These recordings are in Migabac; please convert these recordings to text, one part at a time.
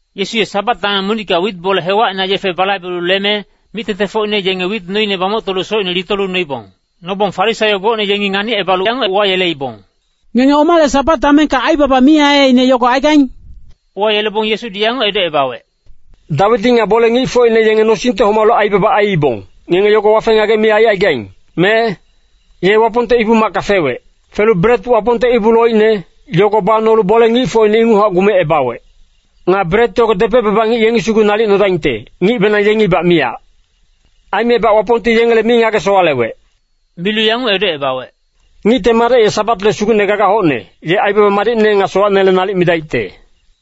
Yesu ye Sabat dameng monicka wit bole hewacina yefe balaibelu leme, mic-tengtengfocine yenge wit noine bamoctolu socine litolu noibong. Nobong Farisaio gocne yengi nganicebalu yanguc uwayeleibong, “Ngenge omale Sabat damengka aibaba mi aiaiine yogo aigaing?” Uwayelebong Yesudi yanguc edocebawec, “Dawidi nga bole-ngicfocine yenge nosingte homalu aibaba aiibong, ngenge yogo wafe-ngagec mi aicaigaing, me? Ye Wapongte Ibu-macka fewec. Felu bret Wapongte ibu loicne, yogo banolu bole-ngicfocine inguchac gumecebawec. Nga bret yogo depec-baba ngic yengi sugu nalic nodaingte, ngicbenang yengibac miyac. Aimebac Wapongti yengele mi ngage-sowalewec.” Milu yanguc edocebawec, “Ngicte Madec ye Sabatle Sugucne gagac hocne, ye aibaba madicne nga sowacnele nalic midaicte.”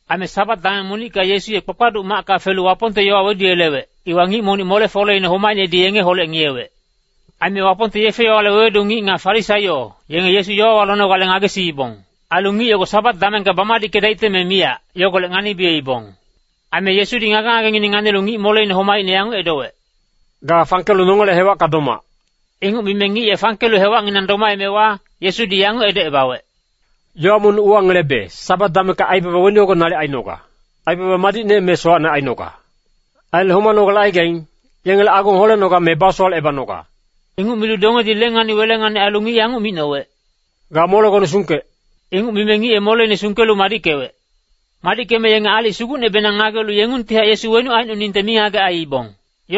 Aime Sabat dameng monicka Yesu ye kpakpaduc macka felu Wapongte yowa weduyelewec, iwa ngic monic mole-foleine homaicnedi yengeholec ngiyewec. Aime Wapongte yefe-yowale wewedu ngic nga Farisaio, yenge Yesu yowawa lonogale ngagesiibong. Ailu ngic yogo Sabat damengka bamadickedaicte me miyac, yogolec nganibiyeibong. Aime Yesudi ngage-ngagengineng nganilu ngic moleine homaicne yanguc edowec, “Ga fangkelu nongele hewacka domac!” Inguc mime ngic ye fangkelu hewacnginang domaemewa, Yesudi yanguc edocebawec, “Yowa monic uwangelebe, Sabat damengka aibaba weni yogo nalic ainoga, aibaba madicne me sowacne ainoga? Ailu homanogale aigaing, yengele agong holenoga me basowalecebanoga?” Inguc milu dongedi lengani-welengani ailu ngic yanguc micnowec, “Ga molegone sungkec!” Inguc mime ngic ye moleine sungkelu madickewec. Madickeme yenge aalic sugucnebenang ngagelu yengungtihac Yesu wenuc aicnoningte mingagec aiibong.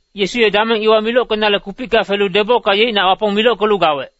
Yesu ye dameng iwa milockenale kupicka felu debocka yeicnac Wapong milockelu gawec.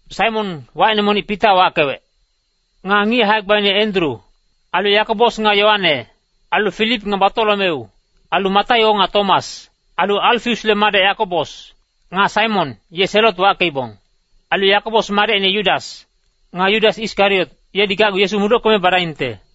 Saimon, wacine monic Pita wackewec. Nga ngic hae-gbaine Endru. Ailu Yakobos nga Yoane. Ailu Filip nga Batolomeu. Ailu Mataio nga Tomas. Ailu Alfaiusle madec Yakobos. Nga Saimon, ye Selot wackeibong. Ailu Yakobos madecine Yudas. Nga Yudas Iskariot, yedi gacgu Yesu mudockeme badaingte.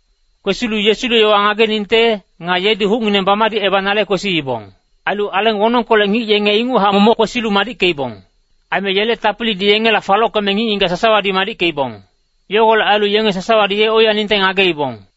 Kwesilu Yesule yowa ngageningte, nga yedi hucngineng bamadicebanale kwesiibong. Ailu aleng wonongkolec ngic yenge inguchac momoc kwesilu madickeibong. Aime yele tapilidi yengela falockeme ngic-ngigac sasawadi madickeibong. Yogolec ailu yenge sasawadi ye oiyaningte ngageibong.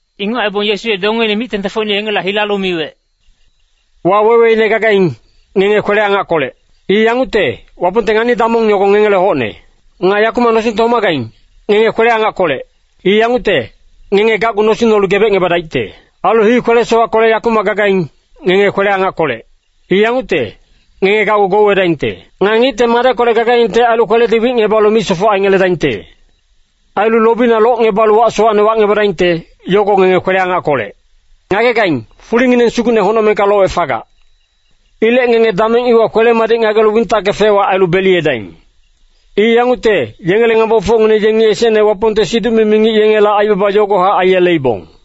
Inguc aibong Yesu ye dongeine mic-tengtengfocine yengela hilalu miwec, “Waweweine gagaing, ngenge kwele-angackolec. I yangucte, Wapongte ngani-damong yogo ngengele hocne. Nga yakumac nosingte homagaing, ngenge kwele-angackolec. I yangucte, ngenge gacgu nosing nolu gebecngebadaicte. Ailu hii kwele-sowackolec yakumac gagaing, ngenge kwele-angackolec. I yangucte, ngenge gacgu gouwedaingte. Nga Ngicte Madeckolec gagaingte ailu kweledi wicngebalu misofoc aingeledaingte. Ailu lobina locngebalu wac sowacne wacngebadaingte, yogo ngenge kwele-angackolec. “Ngagegaing, fulingineng sugucne honocmengka lowec fagac. Ilec ngenge dameng iwa kwele-madic ngagelu wintacke fec-wac ailu beliyedaing. I yangucte, yengele ngambofocngineng yengi esecne Wapongte siduc-mimi ngic yengela aibaba yogohac aiyeleibong.”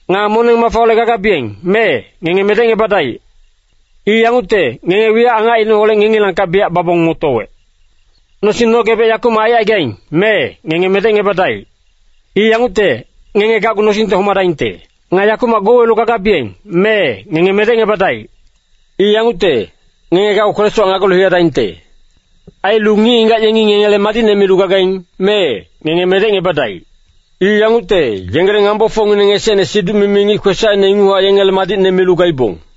“Nga moneng-mafaholec gagabiyeng, mee, ngenge medecngebadaic. I yangucte, ngenge wiyac angacineholec ngengilangkac biyac babong motowec. Nosing nogebec yakumac aicaigaing, mee, ngenge medecngebadaic. I yangucte, ngenge gacgu nosingte homadaingte. Nga yakumac gouwelu gagabiyeng, mee, ngenge medecngebadaic. I yangucte, ngenge gacgu kwele-sowac ngagelu hiyadaingte. Ailu ngic-ngigac yengi ngengele madicne milu gagaing, mee, ngenge medecngebadaic. I yangucte, yengele ngambofocngineng esecne siduc-mimi ngic kwesacine inguchac yengele madicne milu gaibong.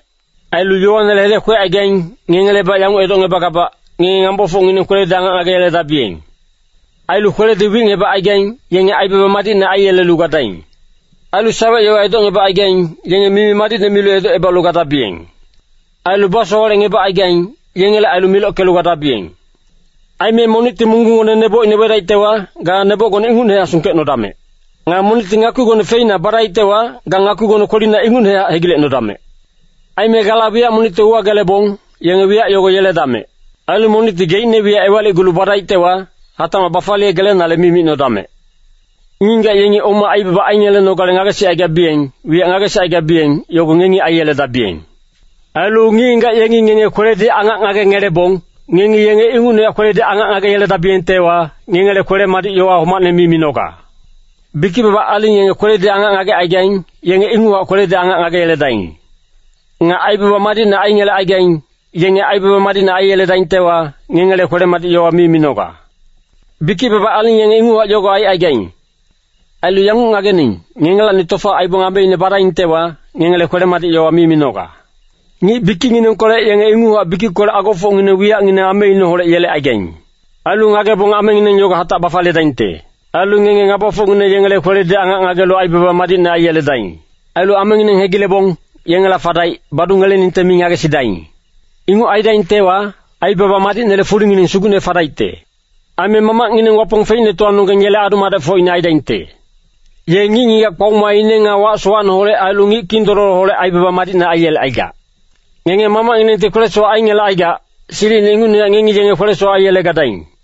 “Ailu yowanele hedec kwecaigaing, ngengebac yanguc edocngebagabac, ngenge ngabafocngineng kweledi angac ngageyeledabiyeng. Ailu kweledi wicngebacaigaing, yenge aibaba madicne aiyelelu gadaing. Ailu sawec-yowa edocngebacaigaing, yenge mimi-madic milu edocebalu gadabiyeng. Ailu basowalecngebacaigaing, yengele ailu milockelu gadabiyeng. Aime monicti munggunggone neboc wedaictewa, ga nebocgone ingucnehac sungkecnodamec. Nga monicti ngakpigone feina badaictewa, ga ngakpigone kwelina ingucnehac hegilecnodamec. Aime gala wiyac monicte uwagelebong, yenge wiyac yogo yeledamec. Ailu monicti geicne wiyac ewalicgulu badaictewa, hatacmac bafaliyegelenale mi micnodamec. Ngic-ngigac yengi oma aibaba aingelenogale ngagesicaigabiyeng, wiyac ngagesicaigabiyeng, yogo ngengi aiyeledabiyeng. “Ailu ngic-ngigac yengi ngenge kweledi angac ngagengelebong, ngengi yenge ingucnehac kweledi angac ngageyeledabiyengtewa, ngengele kwele-madic yowa homacne mi minoga. Bikic-baba aling yenge kweledi angac ngagecaigaing, yenge inguchac kweledi angac ngageyeledaing. Nga aibaba madicne aingelecaigaing, yenge aibaba madicne aiyeledaingtewa, ngengele kwele-madic yowa mi minoga. Bikic-baba aling yenge inguchac yogo aicaigaing. Ailu yanguc ngagening, ngengelacni tofa aibong ameine badaingtewa, ngengele kwele-madic yowa mi minoga. Ngic bikicnginengkolec yenge inguchac bikickolec agofocngineng wiyacngineng ameineholec yelecaigaing. Ailu ngagebong amengineng yogo hatac bafaliyedaingte. Ailu ngenge ngabafocngineng yengele kweledi angac ngagelu aibaba madicne aiyeledaing. Ailu amengineng hegilebong, yengela fadaic, badungeleningte mi ngagesidaing. Inguc aidaingtewa, aibaba madicnele fulingineng sugucne fadaicte. Aime Mamacngineng Wapong Feicnetowanonggeng yele adu-madecfocine aidaingte. Ye ngic-ngigac kpaomaine nga wac sowacneholec ailu ngic kindololoholec aibaba madicne aiyelecaigac. Ngenge Mamacnginengti kwele-sowac aingelecaigac, silicine ingucnehac ngengi yenge kwele-sowac aiyelegadaing.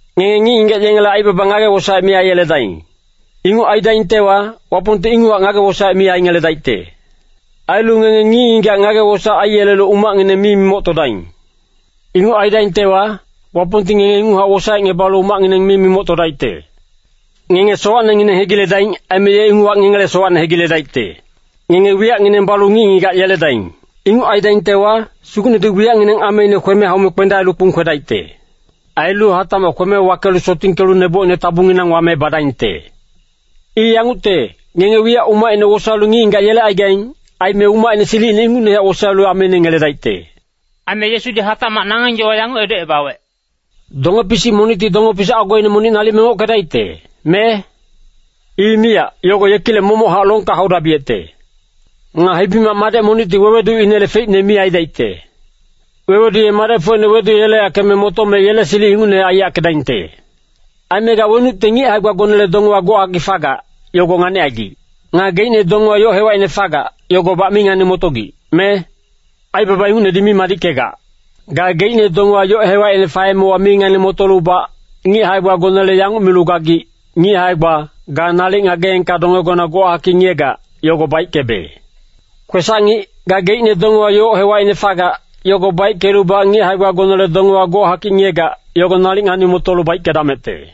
“Ngenge ngic-ngigac yengele aibaba ngage-wosaec mi aiyeledaing. Inguc aidaingtewa, Wapongti inguchac ngage-wosaec mi aingeledaicte. Ailu ngenge ngic-ngigac ngage-wosaec aiyelelu umacngineng mi mimoctodaing. Inguc aidaingtewa, Wapongti ngenge inguchac wosaecngebalu umacngineng mi mimoctodaicte. Ngenge sowacnengineng hegiledaing, aime ye inguchac ngengele sowacne hegiledaicte. Ngenge wiyacngineng balu ngic-ngigac yeledaing. Inguc aidaingtewa, Sugucnedi wiyacngineng ameine kweme haume kpendaelu kpung kwedaicte. Ailu hatacmac kweme wakelu sotingkelu nebocine tabunginang wame badaingte. I yangucte, ngenge wiyac umacine wosaelu ngic-ngigac yelecaigaing, aime umacine silicine ingucnehac wosaelu ameine ngeledaicte.” Aime Yesudi hatacmac nangeng yowa yanguc edocebawec, “Donge-pisic monicti donge-pisic agoine monic nalic mengockedaicte, me? I miyac, yogo yekilec momochac longka haudabiyecte. Nga hibi-mac madec monicti weweduinele feicne mi aidaicte. Wewedu ye madecfocine weduyeleyackeme motome yele silic ingucnehac aiyackedaingte. “Aime ga wenucte ngic hae-gbagonele dongewa gochakic fagac, yogo nganicaigic. Nga geicne dongewa yoc hewacine fagac, yogobac mi ngani-motogic, me? Aibaba ingucnedi mi madickegac. Gageicne dongewa yoc hewacine faemewa mi ngani-motolubac, ngic hae-gbagonele yanguc milu gagic, ‘Ngic hae-gba, ga nalic ngageengka dongegona gochakic ngiyegac, yogo baickebe.’ Kwesac-ngic, gageicne dongewa yoc hewacine fagac, yogo baickelubac ngic hae-gbagonele dongewa gochakic ngiyegac, yogo nalic ngani-motolu baickedamecte.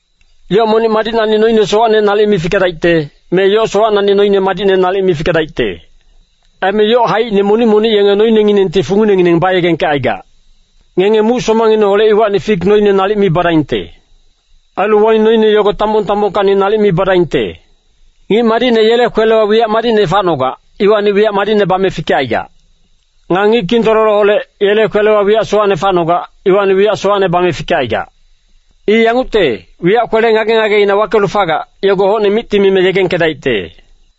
“Yoc monic madicnacni noine sowacne nalic mi fikedaicte, me yoc sowacnacni noine madicne nalic mi fikedaicte. Aime yoc haicine monic monic yenge noinenginengti funginengineng bayegengkecaigac. Ngenge muc somangineholec iwacni fik noine nalic mi badaingte. Ailu waing noine yogo tambong-tambongkacni nalic mi badaingte. Ngic madicne yele kwelewa wiyac madicne facnogac, iwacni wiyac madicne bame fikecaigac. Nga ngic kindololoholec, yele kwelewa wiyac sowacne facnogac, iwacni wiyac sowacne bame fikecaigac. I yangucte, wiyac kwele ngage-ngageina wakelu fagac, yogo hocne micti mime yegengkedaicte.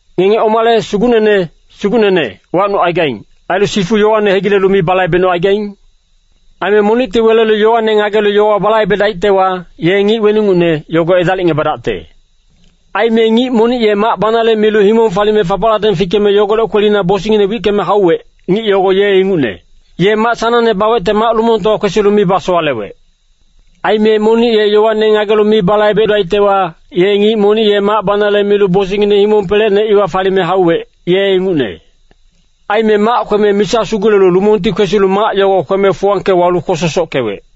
“Ngenge omale ‘Sugucnene, Sugucnene,’ wacnucaigaing, ailu sifu yowane hegilelu mi balaibecnucaigaing? Aime monicti welelu yowane ngagelu yogo balaibedaictewa, ye ngic weningucne, yogo edalicngebadacte. Aime ngic monic ye mac banale milu himong falime fapacladeng fikeme yogolec kwelina bosingngine wickeme hauwec, ngic yogo ye ingucne. Ye mac sanangne bawecte mac lumongtowa kwesilu mi basowalewec. Aime monic ye yowane ngagelu mi balaibedaictewa, ye ngic monic ye mac banale milu bosingngine himong pelecne iwa falime hauwec, ye ingucne. Aime mac kweme misa sugulelu lumongti kwesilu mac yogo kweme fuwangke walu kwososockewec.”